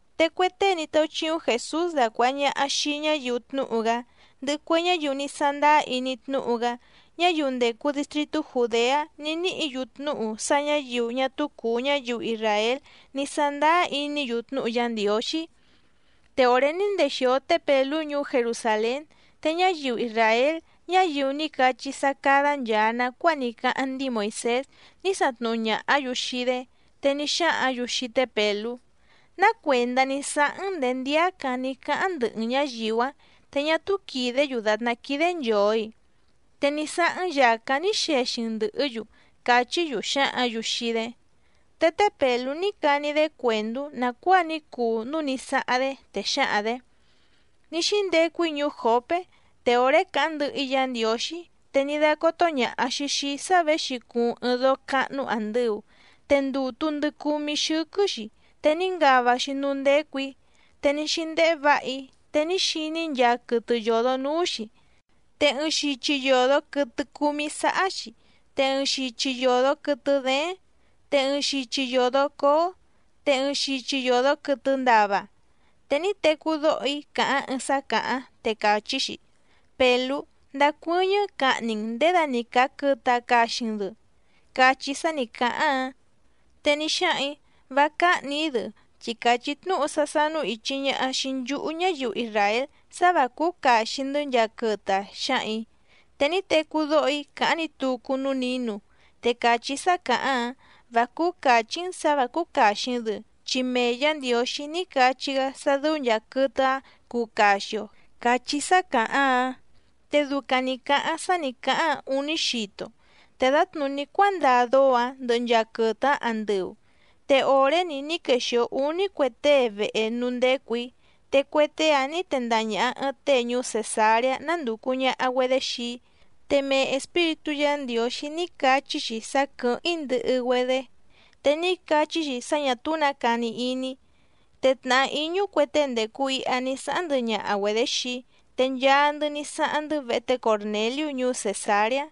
Te cue tée ní táúchíúⁿ Jèsús dacuàha ñaha xii ñáyiu tnúhu‑gá, ndɨhɨ cue ñáyiu ní sándáá iní tnúhu‑gá, ñáyiu ndècu distritú Jùdeá ní níhǐ‑yu tnúhu sá ñǎyiu ñá túú cùu ñáyiu isràél ní sándáá iní‑yu tnúhu Yá Ndiǒxí. Te òré ní ndexìo té Pèlú ñuú Jerusàlén, te ñáyiu isràél ñáyiu ní cachí sá cádá nchàa nacuáa ní cáháⁿ ndíi Moìsés ní satnuhu ñàhá‑yu xii‑dé. Te ní xáhǎⁿ‑yu xii té Pèlú: —¿Ná cuèndá ní sáháⁿ‑n nděé ndíácǎⁿ ní cáháⁿ ndɨhɨ‑n ñǎyiu‑ǎⁿ, te ñá túú quìdé‑yu dàtná quídé nchòo‑i? Te ní sáháⁿ‑n yàcáⁿ ní xexi‑n ndɨ̀hɨ́‑yu —càchí‑yu xǎhǎⁿ‑yu xii‑dé. Te té Pèlú ní cani‑dé cuèndú nàcuáa ní cuu núú nǐ sáháⁿ‑dé, te xǎhaⁿ‑dě: —Ní xíndecu‑í ñuú Jòpé. Te òré càháⁿ ndɨhɨ‑í Yǎ Ndiǒxí, te ní dácótó ñàha‑xi xii‑í sá věxi cuuⁿ ɨɨⁿ dóó cáhnú àndɨu, te ndùtu ndɨ cumí xɨ́quɨ́‑xi, te ní ngava‑xi núú ndécù‑í. Te ní xíndéhé vǎha‑í, te ní xiní‑í nchaa quɨtɨ yòdo núú‑xi. Te ɨɨⁿ xichi yòdo quɨtɨ cúmí sáhá‑xi, te ɨɨⁿ xichi yòdo quɨtɨ dééⁿ, te ɨɨⁿ xichi yòdo cóó, te ɨɨⁿ xichi yòdo quɨtɨ ndava. Te ní tecú dóho‑í càháⁿ ɨɨⁿ sá càháⁿ, te càchí‑xi: “Pèlú, ndacuɨ́ñɨ́ cahni‑n nděda‑ni càa quɨtɨ‑a caxi‑n‑dɨ”, cachí sá nǐ cáháⁿ‑áⁿ. Te ní xáhaⁿ‑ǐ: “Vá cáhnì‑í‑dɨ chi càchí tnúhu sá sánú ìchi ñaha xii nchúhú ñáyiu isràél sá vǎ cúú càxi‑ndɨ́ nchaa quɨtɨ‑a”, xǎhaⁿ‑ǐ. Te ní tecú dóho‑í càháⁿ‑ni tucu núú nǐnu, te càchí sá càháⁿ‑áⁿ: “Vá cúú càchí‑n sǎ vǎ cúú càxi‑n‑dɨ, chi mee Yǎ Ndiǒxí ní cachí‑gá sá dɨ́ú nchàa quɨtɨ‑áⁿ cuu caxi‑o”, càchí sá càháⁿ‑áⁿ. Te ducaⁿ nǐ cáháⁿ sá nì cáháⁿ‑áⁿ ǔní xito, te dǎtnùní cuándaa dóó‑ǎⁿ ndɨhɨ nchaa quɨtɨ‑áⁿ andɨu. Te òré‑ni ní quexìo úní cue tée vehe núú ndécù‑í. Te cue tée‑áⁿ nǐ tendaha ñàha ɨɨⁿ tée ñuú Cèsareá nándùcu ñaha‑güedé xii‑í. Te mee Espíritú Yǎ Ndiǒxí ní cachí‑xi sá quɨ̀hɨ́ⁿ‑í ndɨhɨ‑güedé, te ní cachí‑xi sá ñà túú nǎ cani iní‑í. Te tnàhá íñú cue tée ndècu iha ní sáháⁿ ndɨhɨ ñaha‑güedě xii‑í, te nchaa‑ndɨ́ ní sáháⁿ‑ndɨ́ vehe té Còrneliú ñuú Cèsareá.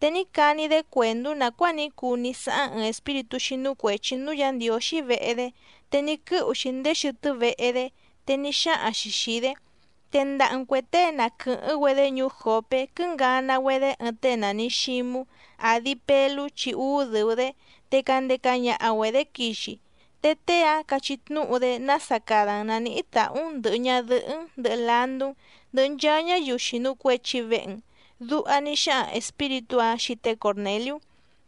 Te ní cani‑dé cuèndú nàcuáa ní cuu ní sáháⁿ ɨɨⁿ espíritú xínú cuèchi núú Yǎ Ndiǒxí vehe‑dé, te ní quɨ́hu‑xi ndéé xɨtɨ́ vehe‑dé, te ní xáhaⁿ‑xi xìi‑dé: “Tendaha‑n cuè tée na quɨ̀hɨ́ⁿ‑güedé ñuú Jòpé quɨ́ngana‑güedé ɨɨⁿ tée nàni Xímú, àdi Pelú chi úú dɨ̀u‑dé. Te candeca ñaha‑güedě quixi. Te tée‑áⁿ cachí tnúhu‑dé nása cada‑n nàníhí tàhú‑n ndɨ̀hɨ ñadɨhɨ́‑n, ndɨhɨ landú‑n, ndɨhɨ nchaa ñáyiu xìnu cuechi vehe‑n”, duha ní xáhaⁿ espíritú‑áⁿ xii té Còrneliú.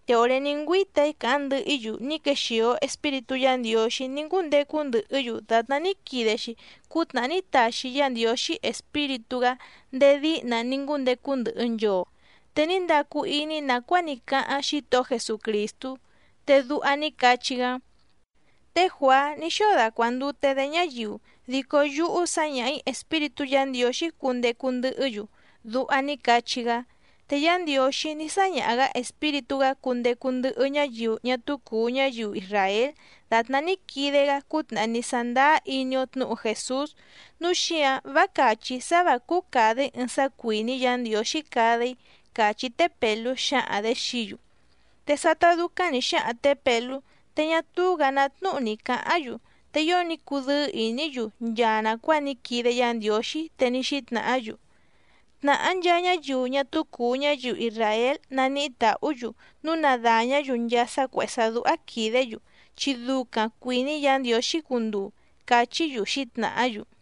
Te òré ní ngüíta‑í càháⁿ ndɨhɨ‑í‑yu ní quexìo Espíritú Yǎ Ndiǒxí ní ngúndecu ndɨhɨ́‑yu dàtná ní quide‑xi cútnàhá ní taxi Yá Ndiǒxí Espíritú‑gá ndéé díhna ní ngúndecu ndɨhɨ nchoo. Te ní ndacu iní‑í nàcuáa ní cáháⁿ Xítohó Jesucrìstú, te duha ní cachí‑gá: “Té Juàá ní xóo dacuàndute‑dé ñáyiu, dico yúhú sǎñaha‑ǐ Espíritú Yǎ Ndiǒxí cundecu ndɨhɨ́‑yu”, duha ní cachí‑gá. Te Yá Ndiǒxí ní sáñaha‑gǎ Espíritú‑gá cundecu ndɨhɨ ñáyiu ñá túú cùu ñáyiu isràél dàtná ní quide‑gá cútnàhá ní sándáá iní‑ó tnǔhu Jèsús, núu xíǎⁿ vá càchí‑í sá vǎ cúú càda‑í ɨɨⁿ sá cuìní Yǎ Ndiǒxí cada‑í —càchí té Pèlú xǎhaⁿ‑dě xií‑yu. Te sátá dúcáⁿ nǐ xáhaⁿ tě Pèlú, te ñá túú‑gǎ ná tnúhu ni cǎháⁿ‑yu, te ío ní cudɨ́ɨ́ ìní‑yu nchaa nàcuáa ní quide Yá Ndiǒxí, te ní xítnàhá‑yu: —Tnàhá nchaa ñáyiu ñá túú cùu ñáyiu isràél naníhí tàhú‑yu núu na dàñá‑yu nchaa sá cuèhé sá dúhá quìdé‑yu, chi ducaⁿ cuìní Yǎ Ndiǒxí cunduu —càchí‑yu xǐtnàhá‑yu.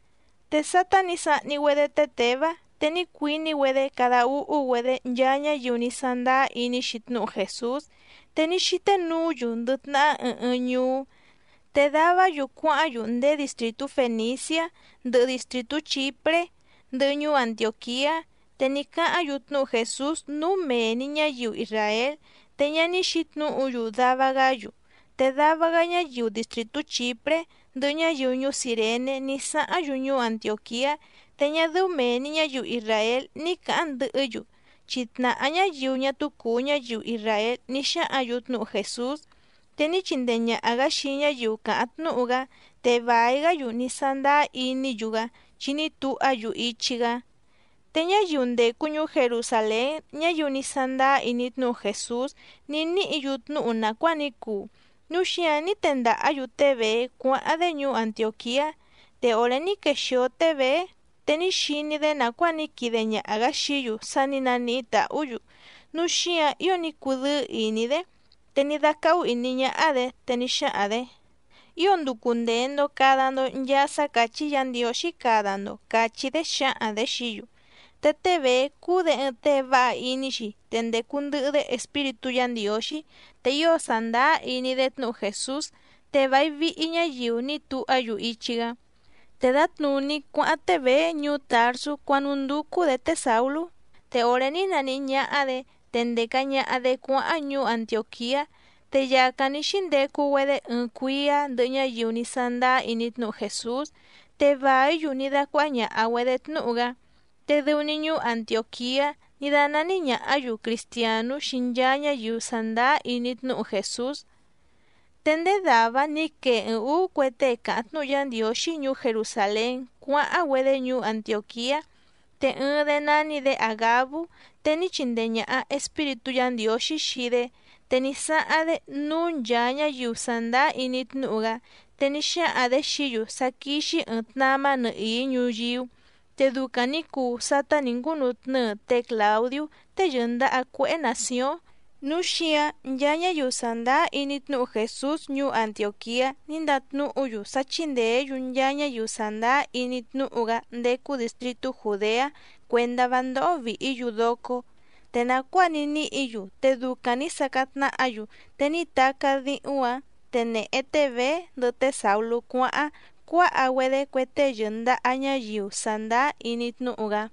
Te sátá nǐ sahni‑güedé té Těvá, te ní cuiní‑güedé cada úhú‑güedé nchaa ñáyiu ní sándáá iní‑xi tnúhu Jèsús, te ní xíté nuú‑yu ndɨ tnahá ɨɨⁿ ɨɨⁿ ñuú. Te davá‑yu cuáháⁿ‑yu ndéé distrìtú Fèniciá ndɨhɨ distrìtú Chìpré ndɨhɨ ñuú Antiòquiá. Te ní cáháⁿ‑yu tnúhu Jèsús núú mee‑ni ñǎyiu isràél, te ñá ní xǐtnǔhu‑yu dava‑gá‑yu. Te dava‑gá ñáyiu distrìtú Chìpré ndɨhɨ ñáyiu ñuú Cìrené ní sáháⁿ‑yu ñuú Antiòquiá. Te ñá dɨ́ú mèe‑ni ñáyiu isràél ní cǎháⁿ ndɨhɨ́‑yu, chi tnàhá ñáyiu ñá túú cùu ñáyiu isràél ní xáhǎⁿ‑yu tnúhu Jèsús. Te ní chindee ñàha‑gá xii ñáyiu càháⁿ tnúhu‑gá, te vài‑gá‑yu ní sándáá iní‑yu‑gá chi ní tuhá‑yu ichi‑gá. Te ñáyiu ndècu ñuú Jerusàlén ñáyiu ní sándáá iní tnúhu Jèsús ní níhǐ‑yu tnúhu nàcuáa ní cuu, núu xíǎⁿ ní tendàhá‑yu té Bèé cuáháⁿ‑dé ñuú Antiòquiá. Te òré ní quexìo té Bèé, te ní xiní‑dé nàcuáa ní quide ñaha‑gǎ xií‑yu sá nǐ naníhí tàhú‑yu, núu xíǎⁿ ío ní cudɨ́ɨ́ ìní‑dé. Te ní dácáhú ìní ñáhá‑dě, te ní xáhaⁿ‑dě: —Ío nducu ndèe‑ndo cada‑ndo nchaa sá càchí Yǎ Ndiǒxí cada‑ndo —càchí‑dé xǎhaⁿ‑dě xií‑yu. Te té Bèé cúú‑dě ɨɨⁿ tée váha iní‑xi, te ndècu ndɨhɨ‑dé Espíritú Yǎ Ndiǒxí, te ío sàndáá iní‑dé tnúhu Jèsús. Te vài vihi ñáyiu ní tuhá‑yu ichi‑gá. Te dǎtnùní cuáháⁿ té Bèé ñuú Tàrsú cuánúndúcú‑dě té Sàulú. Te òré ní naníhí ñáhá‑dě, te ndèca ñaha‑dé cuáháⁿ ñuú Antiòquiá, te yàcáⁿ ní xíndecu‑güedé ɨɨⁿ cuíá ndɨhɨ ñáyiu ní sándáá iní tnúhu Jèsús, te vàí‑yu ní dácuáhá ñàha‑güedé tnúhu‑gá. Te dɨu‑ni ñuú Antiòquiá ní dánání ñàhá‑yu Cristiànú xii nchaa ñáyiu sàndáá iní tnúhu Jèsús. Te ndéé dàvá‑áⁿ nǐ quee ɨɨⁿ ǔú cue tée càháⁿ tnúhu Yá Ndiǒxí ñuú Jerusàlén cuáháⁿ‑güedé ñuú Antiòquiá. Te ɨɨⁿ‑dé nání‑dě Àgabú, te ní chindee ñàha Espíritú Yǎ Ndiǒxí xii‑dé, te ní sáháⁿ‑dé núú nchàa ñáyiu sàndáá iní tnúhu‑gá, te ní xáhaⁿ‑dě xií‑yu sá quíxí ɨ̀ɨⁿ tnamá nɨhìí ñuyíú. Te ducaⁿ nǐ cuu sátá nǐ ngúnutnɨ́ɨ té Clàudiú tée yɨ̀ndaha cuéhé nàcióⁿ. Núu xíǎⁿ nchaa ñáyiu sàndáá iní tnúhu Jèsús ñuú Antiòquiá ní ndatnúhu‑yu sá chíndèé‑yu nchaa ñáyiu sàndáá iní tnúhu‑gá ndécú dìstritú Jùdeá cuèndá vá ndóhó vìhí‑yu docó. Te nàcuáa ní níhǐ‑yu, te ducaⁿ nǐ sacáⁿ tnáhǎ‑yu. Te ní tacá díhúⁿ‑ǎⁿ, te nèhe té Bèé ndɨhɨ té Sàulú cuáháⁿ, cuáha‑güedé cue tée yɨ̀ndaha ñáyiu sàndáá iní tnúhu‑gá.